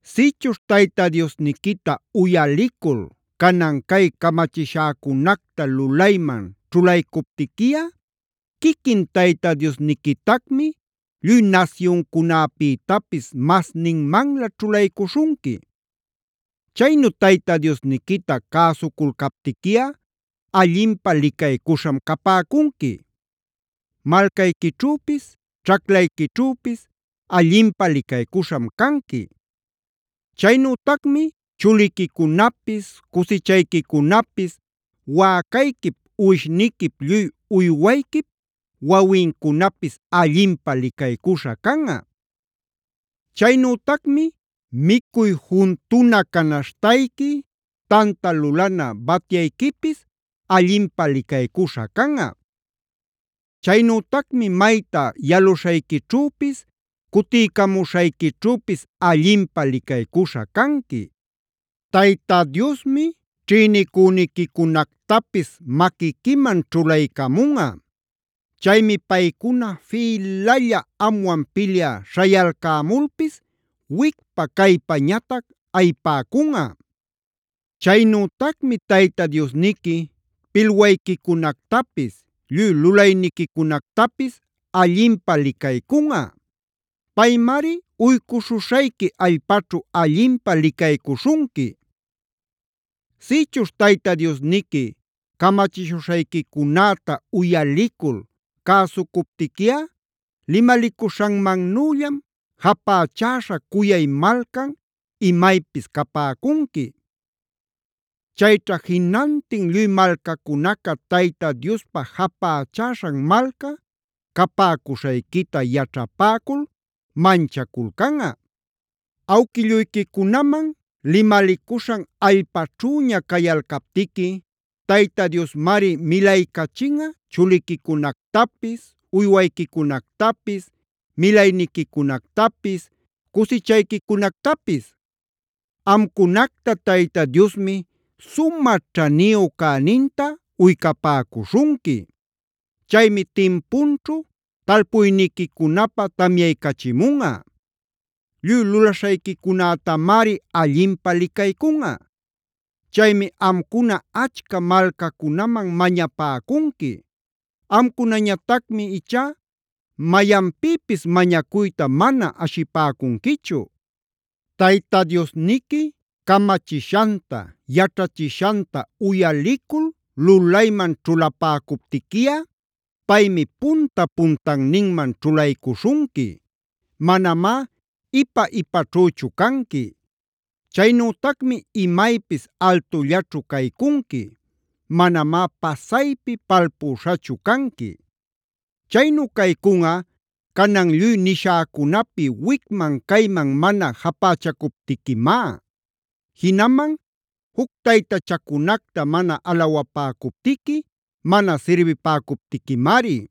“Sïchuśh Tayta Diosniquita uyalicul canan cay camachishäcunacta lulayman ćhulaycuptiquiꞌa quiquin Tayta Diosniquitacmi lluy nasyuncunapïtapis masninmanlä ćhulaycuśhunqui. Chaynu Tayta Diosniquita cäsuculcaptiquiꞌa allinpä licaycuśham capäcunqui:a “Malcayquićhüpis, ćhaclayquićhüpis allinpä licaycuśham canqui. “Chaynütacmi chuliquicunapis, cusichayquicunapis, wäcayquip uwishniquip lluy uywayquip wawincunapis allinpä licaycuśha canꞌa. “Chaynütacmi micuy juntuna canaśhtayqui, tanta lulana batyayquipis allinpä licaycuśha canꞌa. “Chaynütacmi mayta yaluśhayquićhüpis, cutiycamuśhayquićhüpis allinpä licaycuśha canqui. “Tayta Diosmi ćhïnicüniquicunactapis maquiquiman ćhulaycamunꞌa. Chaymi paycuna fïlalla amwan pilyä śhayalcämulpis wicpa caypañatac ayipäcunꞌa. “Chaynütacmi Tayta Diosniqui pilwayquicunactapis, lluy lulayniquicunactapis allinpä licaycunꞌa. Paymari uycuśhuśhayqui allpaćhu allinpä licaycuśhunqui. “Sïchuśh Tayta Diosniqui camachishuśhayquicunäta uyalicul cäsucuptiquiꞌa limalicuśhanmannüllam japächäśha cuyay malcan imaypis capäcunqui. Chayćha jinantin lluy malcacunaca Tayta Diospa japächäśhan malca capäcuśhayquita yaćhapäcul manchaculcanꞌa. Awquilluyquicunaman limalicuśhan allpaćhüña cayalcaptiqui Tayta Diosmari milaycachinꞌa chuliquicunactapis, uywayquicunactapis, milayniquicunactapis, cusichayquicunactapis. Amcunacta Tayta Diosmi sumä ćhaniyu cäninta uycapäcuśhunqui. Chaymi timpunćhu talpuyniquicunapä tamyaycachimunꞌa. Lluy lulaśhayquicunätamari allinpä licaycunꞌa. Chaymi amcuna achca malcacunaman mañapäcunqui; amcunañatacmi ichá mayanpïpis mañacuyta mana ashipäcunquichu. Tayta Diosniqui camachishanta, yaćhachishanta uyalicul lulayman ćhulapäcuptiquiꞌa paymi punta-puntanninman ćhulaycuśhunqui; manamá ipa-ipaćhüchu canqui. Chaynütacmi imaypis altullaćhu caycunqui; manamá pasaypi palpüśhachu canqui. Chaynu caycunꞌa canan lluy nishäcunapi wicman cayman mana japächacuptiquimá. Jinaman juc taytachacunacta mana alawapäcuptiqui, mana sirbipäcuptiquimari.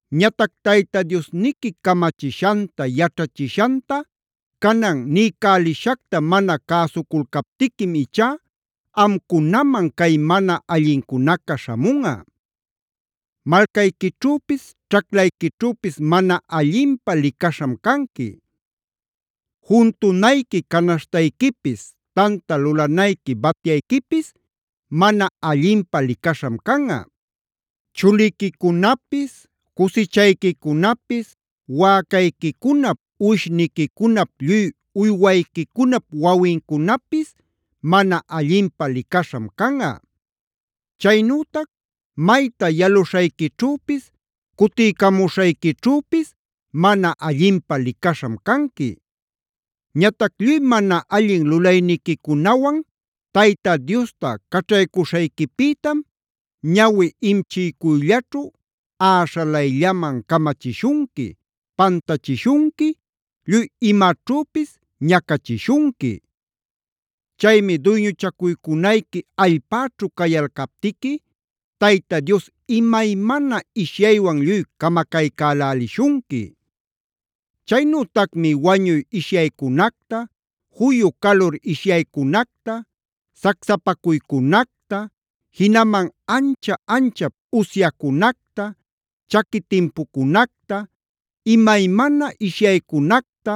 “Ñatac Tayta Diosniqui camachishanta, yaćhachishanta canan niycälishacta mana cäsuculcaptiquim ichá amcunaman cay mana allincunaca śhamunꞌa: “Malcayquićhüpis ćhaclayquićhüpis mana allinpä licaśham canqui. “Juntunayqui canaśhtayquipis, tanta lulanayqui batyayquipis mana allinpä licaśham canꞌa. “Chuliquicunapis, cusichayquicunapis, wäcayquicunap uwishniquicunap lluy uywayquicunap wawincunapis mana allinpä licaśham canꞌa. “Chaynütac mayta yaluśhayquićhüpis cutiycamuśhayquićhüpis mana allinpä licaśham canqui. “Ñatac lluy mana allin lulayniquicunawan Tayta Diosta caćhaycuśhayquipïtam ñawi imchïcuyllaćhu äśhalayllaman camachishunqui, pantachishunqui, lluy imaćhüpis ñacachishunqui. Chaymi duyñuchacunayqui allpäćhu cayalcaptiqui Tayta Dios imaymana ishyaywan lluy camacaycälälishunqui. Chaynütacmi wañuy ishyaycunacta, juyu calur ishyaycunacta, sacsapacuycunacta, jinaman ancha-anchap usyacunacta, chaqui timpucunacta, imaymana ishyaycunacta,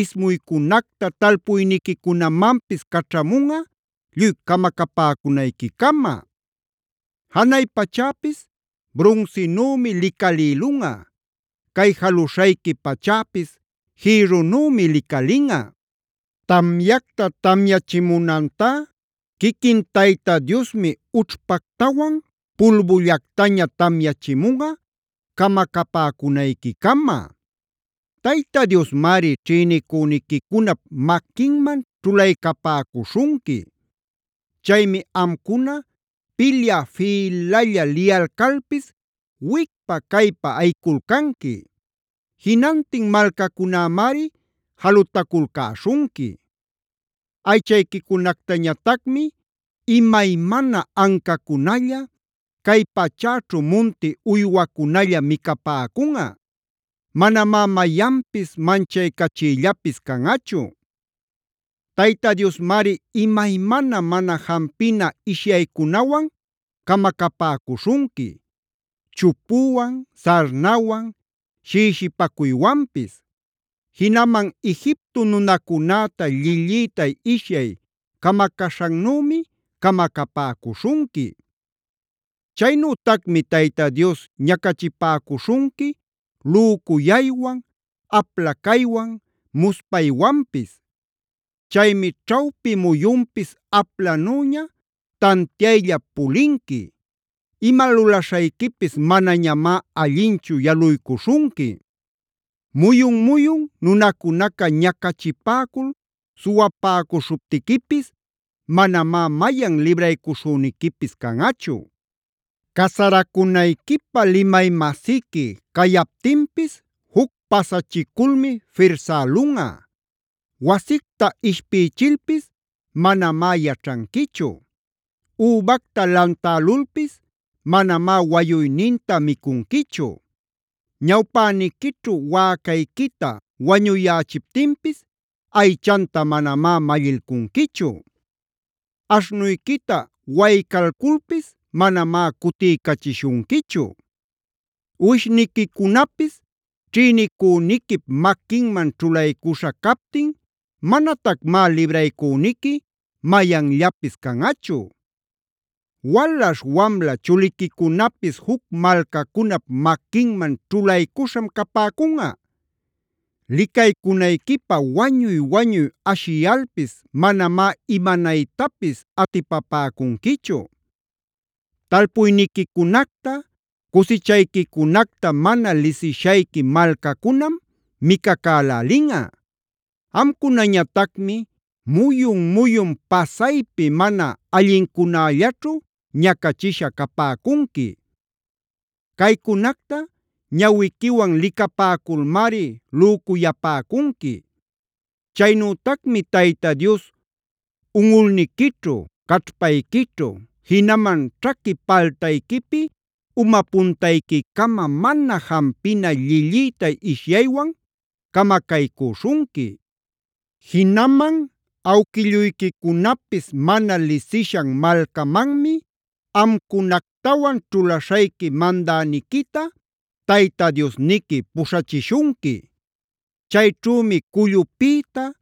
ismuycunacta talpuyniquicunamanpis caćhamunꞌa lluy camacapäcunayquicama. “Janay pachäpis brunsinümi licalïlunꞌa; cay jaluśhayqui pachäpis jïrrunümi licalinꞌa. Tamyacta tamyachimunantá quiquin Tayta Diosmi ućhpactawan pulbullactaña tamyachimunꞌa camacapäcunayquicama. Tayta Diosmari ćhïnicüniquicunap maquinman ćhulaycapäcuśhunqui. Chaymi amcuna pilyä fïlalla liyalcalpis wicpa caypa ayiculcanqui. Jinantin malcacunämari jalutaculcäśhunqui. Aychayquicunactañatacmi imaymana ancacunalla, cay pachäćhu munti uywacunalla micapäcunꞌa; manamá mayanpis manchaycachïllapis canꞌachu. “Tayta Diosmari imaymana mana jampina ishyaycunawan camacapäcuśhunqui: chupuwan, sarnawan, shïshipacuywanpis. Jinaman Egipto nunacunäta llillïtay ishyay camacaśhannümi camacapäcuśhunqui. Chaynütacmi Tayta Dios ñacachipäcuśhunqui lücuyaywan, apla caywan, muspaywanpis. Chaymi ćhawpi muyunpis aplanüña tantiayllap pulinqui. Ima lulaśhayquipis manañamá allinchu yaluycuśhunqui. Muyun-muyun nunacunaca ñacachipäcul suwapäcuśhuptiquipis manamá mayan libraycuśhüniquipis canꞌachu. “Casaracunayquipä limay-masiqui cayaptinpis juc pasachiculmi firsälunꞌa. Wasicta ishpïchilpis manamá yaćhanquichu. Übacta lantälulpis manamá wayuyninta micunquichu. Ñawpäniquićhu wäcayquita wañüyächiptinpis aychanta manamá mallilcunquichu. Aśhnuyquita waycalculpis manamá cutiycachishunquichu. Uwishniquicunapis ćhïnicüniquip maquinman ćhulaycuśha captin manatacmá libraycüniqui mayanllapis canꞌachu. Walaśh wamla chuliquicunapis juc malcacunap maquinman ćhulaycuśham capäcunꞌa. Licaycunayquipä wañuy-wañuy ashiyalpis manamá imanaytapis atipapäcunquichu. Talpuyniquicunacta, cusichayquicunacta mana lisishayqui malcacunam micacälälinꞌa. Amcunañatacmi muyun-muyun pasaypi mana allincunällaćhu ñacachisha capäcunqui. Caycunacta ñawiquiwan licapäculmari lücuyapäcunqui. Chaynütacmi Tayta Dios unꞌulniquićhu, caćhpayquićhu, jinaman ćhaqui paltayquipi uma puntayquicama mana jampina llillïtay ishyaywan camacaycüśhunqui. “Jinaman awquilluyquicunapis mana lisishan malcamanmi amcunactawan ćhulaśhayqui mandäniquita Tayta Diosniqui puśhachishunqui. Chayćhümi cullupïta,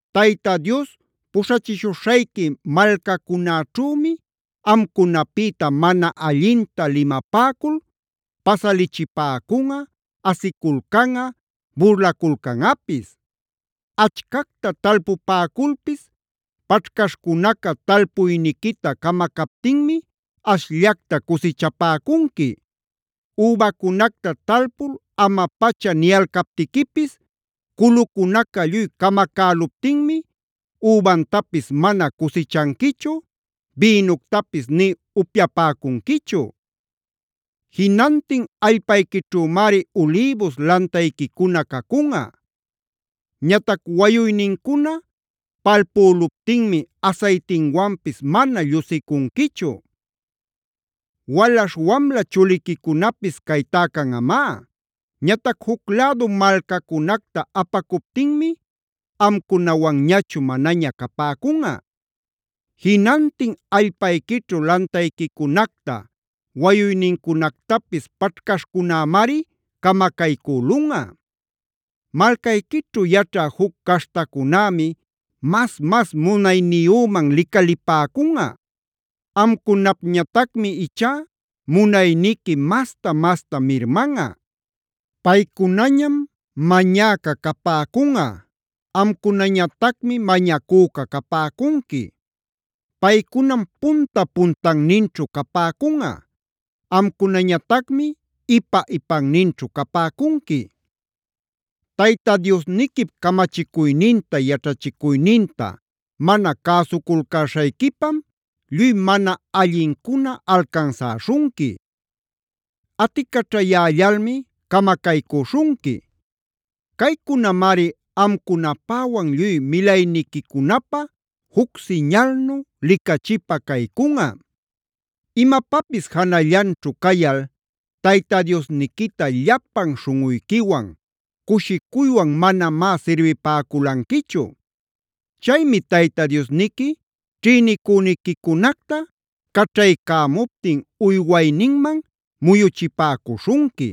Tayta Dios puśhachishuśhayqui malcacunäćhümi amcunapïta mana allinta limapäcul pasalichipäcunꞌa, asiculcanꞌa, burlaculcanꞌapis. Achcacta talpupäculpis paćhcaśhcunaca talpuyniquita camacaptinmi ashllacta cusichapäcunqui. Übacunacta talpul ama-pacha niyalcaptiquipis culucunaca lluy camacäluptinmi übantapis mana cusichanquichu, bïnuctapis ni upyapäcunquichu. Jinantin allpayquićhümari ulïbus lantayquicuna cacunꞌa. Ñatac wayuynincuna palpüluptinmi asaytinwanpis mana llusicunquichu. Walaśh wamla chuliquicunapis caytá canꞌamá. Ñatac juc lädu malcacunacta apacuptinmi amcunawanñachu manaña capäcunꞌa. Jinantin allpayquićhu lantayquicunacta, wayuynincunactapis paćhcaśhcunämari camacaycülunꞌa. Malcayquićhu yaćhä juc caśhtacunämi mas-mas munayniyüman licalipäcunꞌa. Amcunapñatacmi ichá munayniqui masta-masta mirmanꞌa. Paycunañam mañäca capäcunꞌa; amcunañatacmi mañacüca capäcunqui. Paycunam punta-puntanninćhu capäcunꞌa; amcunañatacmi ipa-ipanninćhu capäcunqui. “Tayta Diosniquip camachicuyninta, yaćhachicuyninta mana cäsuculcäśhayquipam lluy mana allincuna alcansäśhunqui. Aticaćhayällalmi camacaycüśhunqui. Caycunamari amcunapäwan lluy milayniquicunapä juc siñalnu, licachipä caycunꞌa. “Imapapis janallanćhu cayal Tayta Diosniquita llapan śhunꞌuyquiwan, cushicuywan manamá sirbipäculanquichu. Chaymi Tayta Diosniqui ćhïnicüniquicunacta caćhaycämuptin uywayninman muyuchipäcuśhunqui.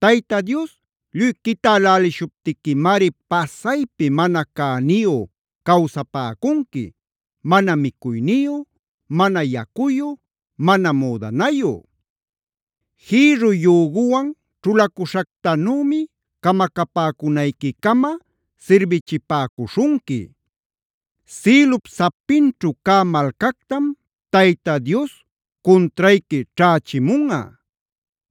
Tayta Dios lluy quitälälishuptiquimari pasaypi mana cäniyu cawsapäcunqui, mana micuyniyu, mana yacuyu, mana müdanayu. Jïrru yüguwan ćhulacuśhactanümi camacapäcunayquicama sirbichipäcuśhunqui. Sïlup sapinćhu cä malcactam Tayta Dios cuntrayqui ćhächimunꞌa.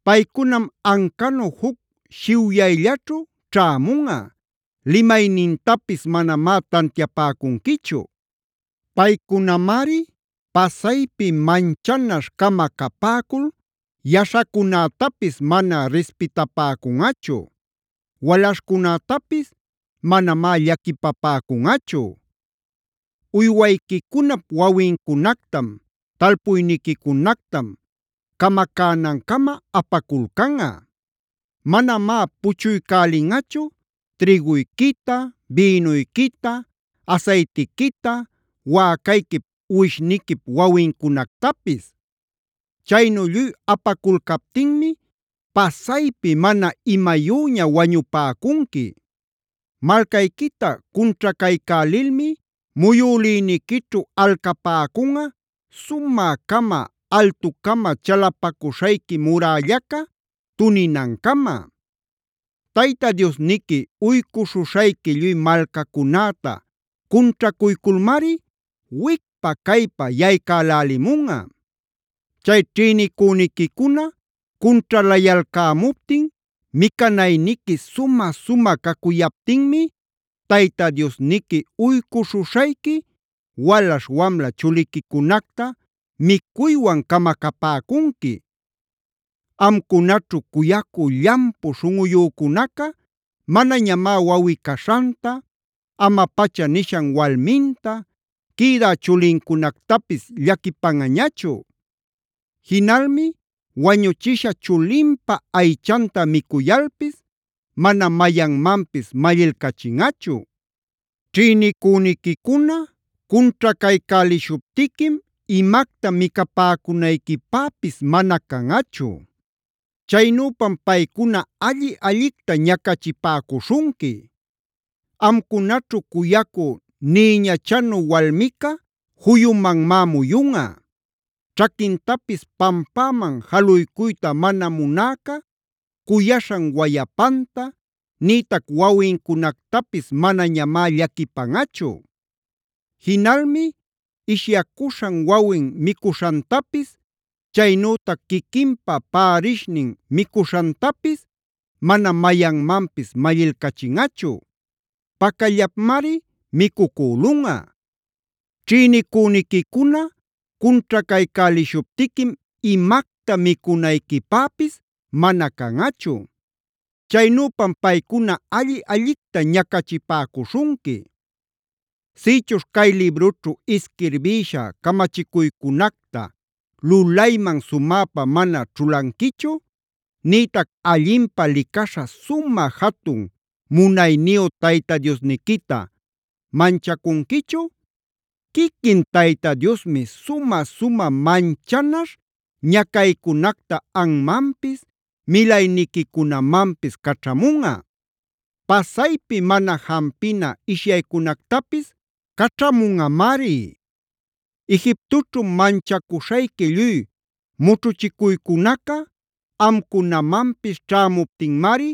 Paycunam ancanu juc shiwyayllaćhu ćhämunꞌa; limaynintapis manamá tantiapäcunquichu. Paycunamari pasaypi manchanaśh-cama capäcul yaśhacunätapis mana rispitapäcunꞌachu; walaśhcunätapis manamá llaquipapäcunꞌachu. Uywayquicunap wawincunactam, talpuyniquicunactam camacänancama apaculcanꞌa. Manamá puchuycälinꞌachu trïguyquita, bïnuyquita, asaytiquita, wäcayquip uwishniquip wawicunactapis. Chaynu lluy apaculcaptinmi pasaypi mana imayüña wañupäcunqui. “Malcayquita cunćhacaycälilmi muyülïniquićhu alcapäcunꞌa sumä-cama, altucama chalapacuśhayqui murällaca tuninancama. Tayta Diosniqui uycuśhuśhayqui lluy malcacunäta cunćhacuyculmari wicpa caypa yaycälälimunꞌa. Chay ćhïnicüniquicuna cunćhalayalcämuptin micanayniqui sumä-sumä cacuyaptinmi Tayta Diosniqui uycuśhuśhayqui walaśh wamla chuliquicunacta micuywan camacapäcunqui. Amcunaćhu cuyacü llampu śhunꞌuyücunaca manañamá wawꞌi-caśhanta, ama-pacha nishan walminta, quïdä chulincunactapis llaquipanꞌañachu. Jinalmi wañuchisha chulinpa aychanta micuyalpis mana mayanmanpis mallilcachinꞌachu. Ćhïnicüniquicuna cunćhacaycälishuptiquim imacta micapäcunayquipäpis mana canꞌachu; chaynüpam paycuna alli-allicta ñacachipäcuśhunqui. Amcunaćhu cuyacü nïñachanu walmica juyumanmá muyunꞌa. Ćhaquintapis pampäman jaluycuyta mana munäca cuyaśhan wayapanta nïtac wawincunactapis manañamá llaquipanꞌachu. Jinalmi ishyacuśhan wawin micuśhantapis, chaynütac quiquinpa pärishninc micuśhantapis mana mayanmanpis mallilcachinꞌachu;d pacallapmari micucülunꞌa. Ćhïnicüniquicuna cunćhacaycälishuptiquim imacta micunayquipäpis mana canꞌachu; chaynüpam paycuna alli-allicta ñacachipäcuśhunqui. “Sïchuśh cay librućhu isquirbïsha camachicuycunacta lulayman sumäpa mana ćhulanquichu, nïtac allinpä licaśha sumä jatun munayniyu Tayta Diosniquita manchacunquichu, quiquin Tayta Diosmi sumä-sumä manchanaśh ñacaycunacta anmanpis milayniquicunamanpis caćhamunꞌa. Pasaypi mana jampina ishyaycunactapis caćhamunꞌamari. Egiptoćhu manchacuśhayqui lluy mućhuchicuycunaca amcunamanpis ćhämuptinmari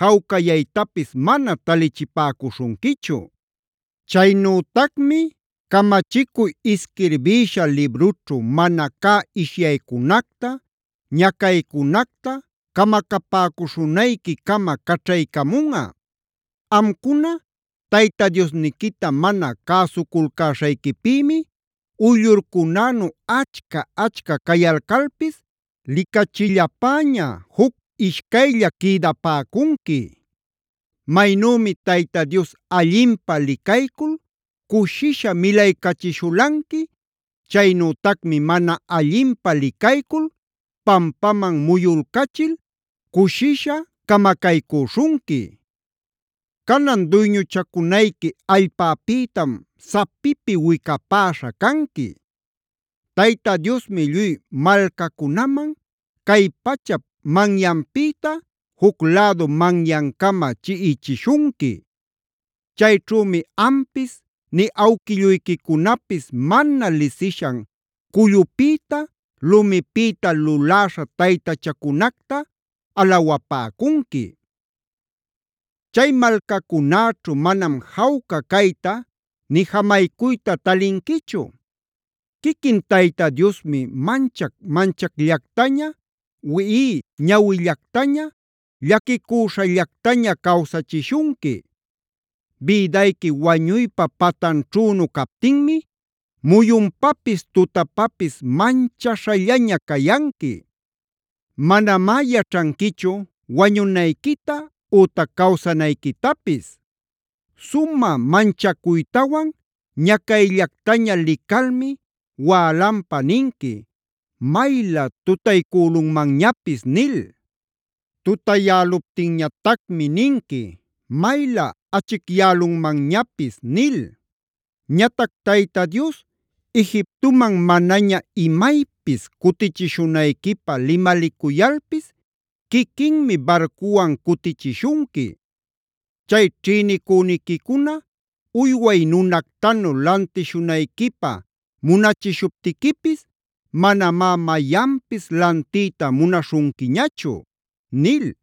jawcayaytapis mana talichipäcuśhunquichu. Chaynütacmi camachicuy isquirbïsha librućhu mana cä ishyaycunacta, ñacaycunacta camacapäcuśhunayquicama caćhaycamunꞌa. Amcuna Tayta Diosniquita mana cäsuculcäśhayquipïmi uyllurcunänu achca-achca cayalcalpis licachillapäña juc ishcaylla quïdapäcunqui. Maynümi Tayta Dios allinpä licaycul cushisha milaycachishulanqui, chaynütacmi mana allinpä licaycul pampaman muyulcachil cushisha camacaycüśhunqui. Canan duyñuchacunayqui allpapïtam sapipi wicapäśha canqui. Tayta Diosmi lluy malcacunaman, cay pachap manyanpïta juc lädu manyancama chiꞌichishunqui. Chayćhümi ampis nï awquilluyquicunapis mana lisishan cullupïta lumipïta luläśha taytachacunacta alawapäcunqui. Chay malcacunäćhu manam jawca cayta nï jamaycuyta talinquichu. Quiquin Tayta Diosmi manchac-manchacllactaña, wiꞌiy ñawillactaña, llaquicüśhallactaña cawsachishunqui. Bïdayqui wañuypa patanćhünu captinmi muyunpapis tutapapis manchaśhallaña cayanqui. Manamá yaćhanquichu wañunayquita ütac cawsanayquitapis. Sumä manchacuytawan ñacayllactaña licalmi wälanpa ninqui: ‘Maylä tutaycülunmanñapis’ nil. Tutayäluptinñatacmi ninqui: ‘Maylä achicyälunmanñapis’ nil. Ñatac Tayta Dios Egiptoman manaña imaypis cutichishunayquipä limalicuyalpis quiquinmi barcuwan cutichishunqui. Chay ćhïnicüniquicuna uyway nunactanu lantishunayquipä munachishuptiquipis manamá mayanpis lantiyta munaśhunquiñachu” nil.